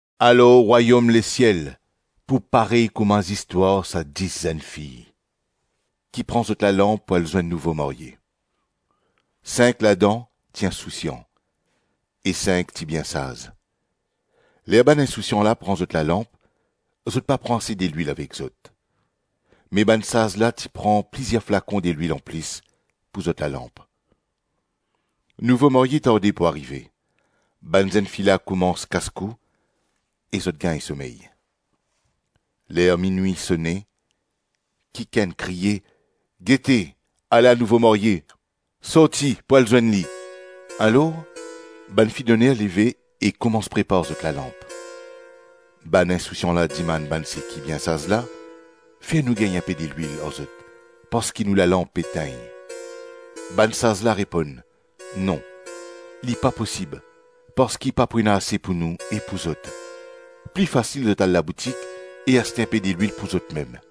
“Alor rwayom lesiel pou parey kouma zistwar sa dis zennfi ki pran zot lalanp pou al zwenn nouvo marye. Sink ladan ti insousian, e sink ti bien saz. Ler bann insousian la pran zot lalanp, zot pa pran ase delwil avek zot; me bann saz la ti pran plizir flakon delwil anplis pou zot lalanp. Nouvo marye tarde pou arive; bann zennfi la koumans kaskou e zot gagn somey. Ler minwi sone, kikenn kriye: ‘Gete! Ala nouvo marye! Sorti pou al zwenn li!’ Alor, bann fidoner leve e koumans prepar zot lalanp. Bann insousian la dimann bann seki bien saz la: ‘Fer nou gagn inpe delwil ar zot, parski nou lalanp pe tegn.’ Bann saz la reponn: ‘Non, li pa posib, parski pa pou ena ase pou nou e pou zot. Pli fasil zot al laboutik e aste inpe delwil pou zotmem.’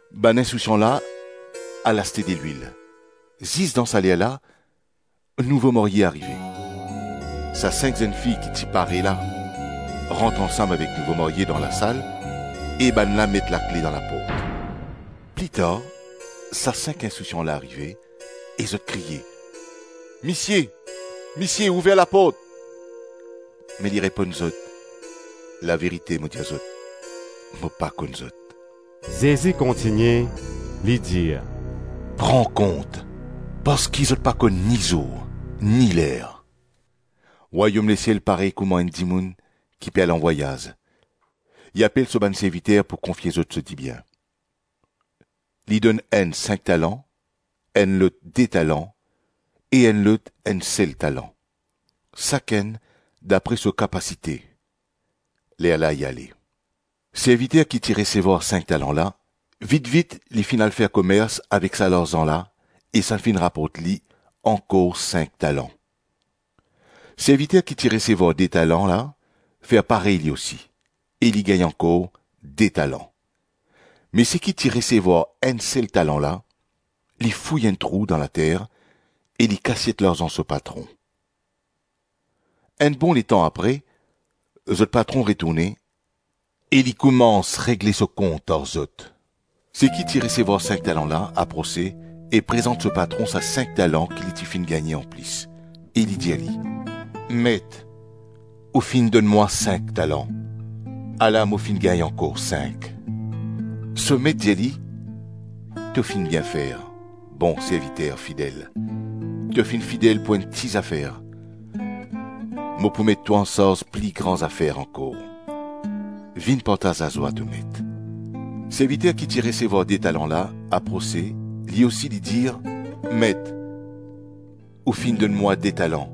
Bann insousian la al aste delwil; zis dan sa lerla, nouvo marye arive. Sa sink zennfi ki ti pare la rant ansam avek nouvo marye dan lasal e bann la met lakle dan laport. Plitar, sa sink insousian la arive, e zot kriye: ‘Misie, misie, ouver laport!’ Me li reponn zot: ‘Laverite, mo dir zot, mo pa konn zot.’” Zezi kontigne, li dir: “Pran kont, parski zot pa konn ni zour, ni ler.” “Rwayom lesiel parey kouma enn dimoun ki pe al anvwayaz, li apel so bann serviter pou konfie zot so dibien. Li donn enn sink talan, enn lot de talan e enn lot enn sel talan, sakenn dapre so kapasite, lerla li ale. Serviter ki ti resevwar sink talan la, vitvit li finn al fer komers avek sa larzan la e sa finn raport li ankor sink talan. Serviter ki ti resevwar de talan la fer parey li osi, e li gagn ankor de talan. Me seki ti resevwar enn sel talan la, li fouy enn trou dan later e li kasiet larzan so patron. Enn bon letan apre, zot patron retourne e li koumans regle so kont ar zot. Seki ti resevwar sink talan la aprose e prezant so patron sa sink talan ki li ti finn gagne anplis, e li dir li: ‘Met, ou finn donn mwa sink talan, ala mo finn gagn ankor sink.’ So met dir li: ‘To finn bien fer, bon serviter fidel. To finn fidel pou enn ti zafer, mo pou met twa ansarz pli gran zafer ankor. Vinn partaz lazwa to met.’ Serviter ki ti resevwar de talan la aprose li osi, li dir: ‘Met, ou finn donn mwa de talan,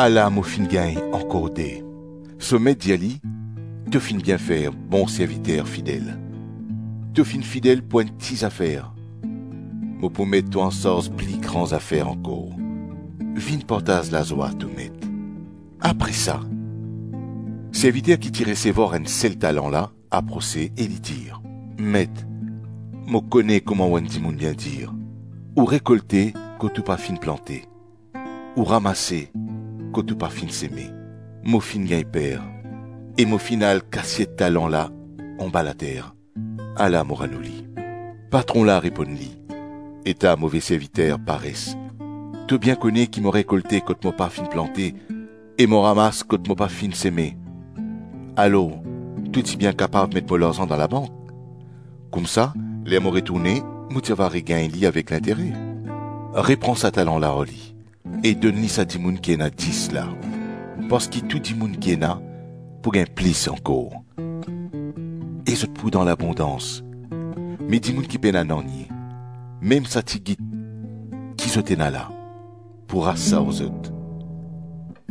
ala mo finn gagn ankor de.’ So met dir li: ‘To finn bien fer, bon serviter fidel. To finn fidel pou enn ti zafer, mo pou met twa ansarz pli gran zafer ankor. Vinn partaz lazwa to met.’ Apre sa, serviter ki ti resevwar enn sel talan la aprose e li dir: ‘Met, mo kone kouma enn dimoun bien ti dir: ou rekolte kot ou pa finn plante, ou ramase kot ou pa finn seme. Mo finn gagn per, e mo finn al kasiet talan la anba later. Ala, mo rann ou li.’ Patron la reponn li, ‘Eta move serviter pares! To bien kone ki mo rekolte kot mo pa finn plante, e mo ramas kot mo pa finn seme? Alor to ti bien kapav met mo larzan dan labank, koumsa ler mo retourne mo ti va regagn li avek lintere. Repran sa talan la ar li e donn li sa dimoun ki ena dis la. Parski tou dimoun ki ena, pou gagn plis ankor, e zot pou dan labondans; me dimoun ki pena nanye, mem sa tigit ki zot ena la, pou ras sa ar zot.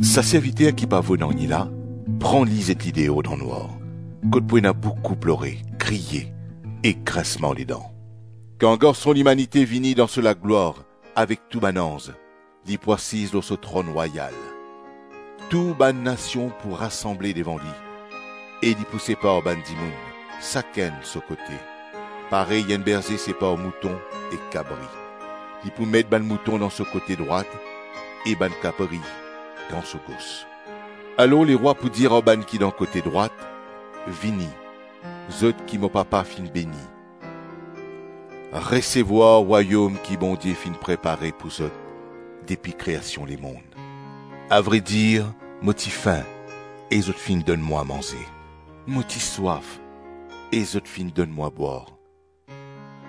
Sa serviter ki pa vo nanye la, pran li zet li deor dan nwar, kot pou ena boukou plore, kriye ek grinsman ledan.’” “Kan Garson Limanite vini dan so laglwar avek tou bann anz, li pou asiz lor so tronn rwayal. Tou bann nasion pou rasanble devan li, e li pou separ bann dimoun sakenn so kote, parey enn berze separ mouton ek kabri. Li pou met bann mouton dan so kote drwat e bann kabri dan so gos. Alor lerwa pou dir ar bann ki dan kote drwat, ‘Vini, zot ki mo papa finn beni. Resevwar rwayom ki Bondie finn prepare pou zot depi kreasion lemonn. Avredir mo ti fin e zot finn donn mwa manze. Mo ti swaf e zot finn donn mwa bwar.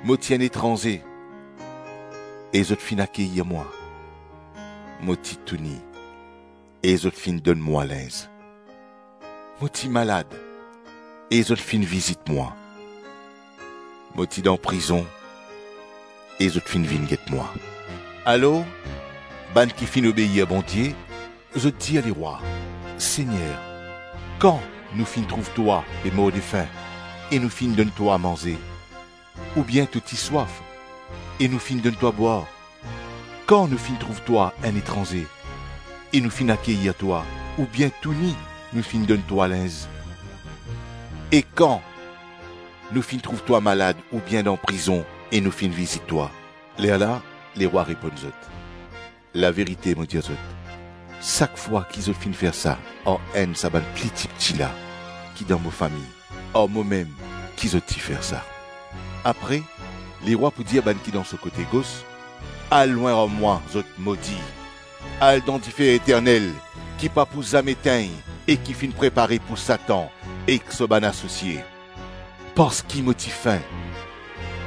Mo ti enn etranze e zot finn akeyir mwa. Mo ti touni, e zot finn donn mwa linz. Mo ti malad, e zot finn vizit mwa. Mo ti dan prizon e zot finn vinn get mwa.’ Alor bann ki finn obeir Bondie, zot dir lerwa: ‘Segner, kan nou finn trouv twa pe mordefin e nou finn donn twa manze? Oubien to ti swaf e nou finn donn twa bwar? Kan nou finn trouv twa enn etranze e nou finn akeyir twa, oubien touni nou finn donn twa linz? E kan nou finn trouv twa malad oubien dan prizon e nou finn vizit twa?’ Lerla lerwa reponn zot: ‘Laverite, mo dir zot, sak fwa ki zot finn fer sa ar enn sa bann pli tipti la ki dan mo fami, ar momem ki zot ti fer sa.’ Apre lerwa pou dir bann ki dan so kote gos: ‘Al lwin ar mwa zot modi! Al dan dife eternel ki pa pou zame tegn e ki finn prepare pou Satan ek so bann asosie. Parski mo ti fin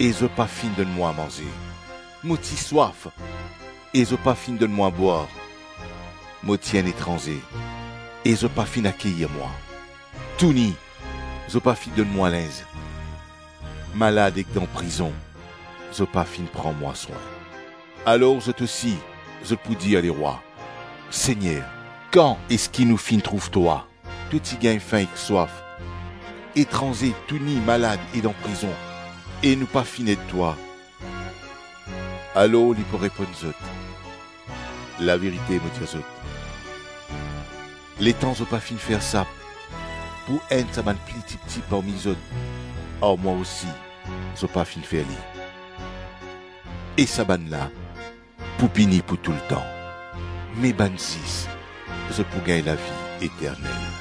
e zot pa finn donn mwa manze. Mo ti swaf e zot pa finn donn mwa bwar. Mo ti enn etranze e zot pa finn akeyir mwa, touni zot pa finn donn mwa linz, malad ek dan prizon, zot pa finn pran mwa swin?’ Alor zot osi, zot pou dir lerwa: ‘Segner, kan eski nou finn trouv twa, to ti gagn fin ek swaf, etranze, touni, malad e dan prizon e nou pa finn ed twa?’ Alor li pou reponn zot: ‘Laverite mo dir zot, letan zot pa finn fer sa pou enn sa bann pli tipti parmi zot, ar mwa osi zot pa finn fer li.’ E sa bann la pou pini pou toultan, me bann zis, zot pou gagn lavi eternel.”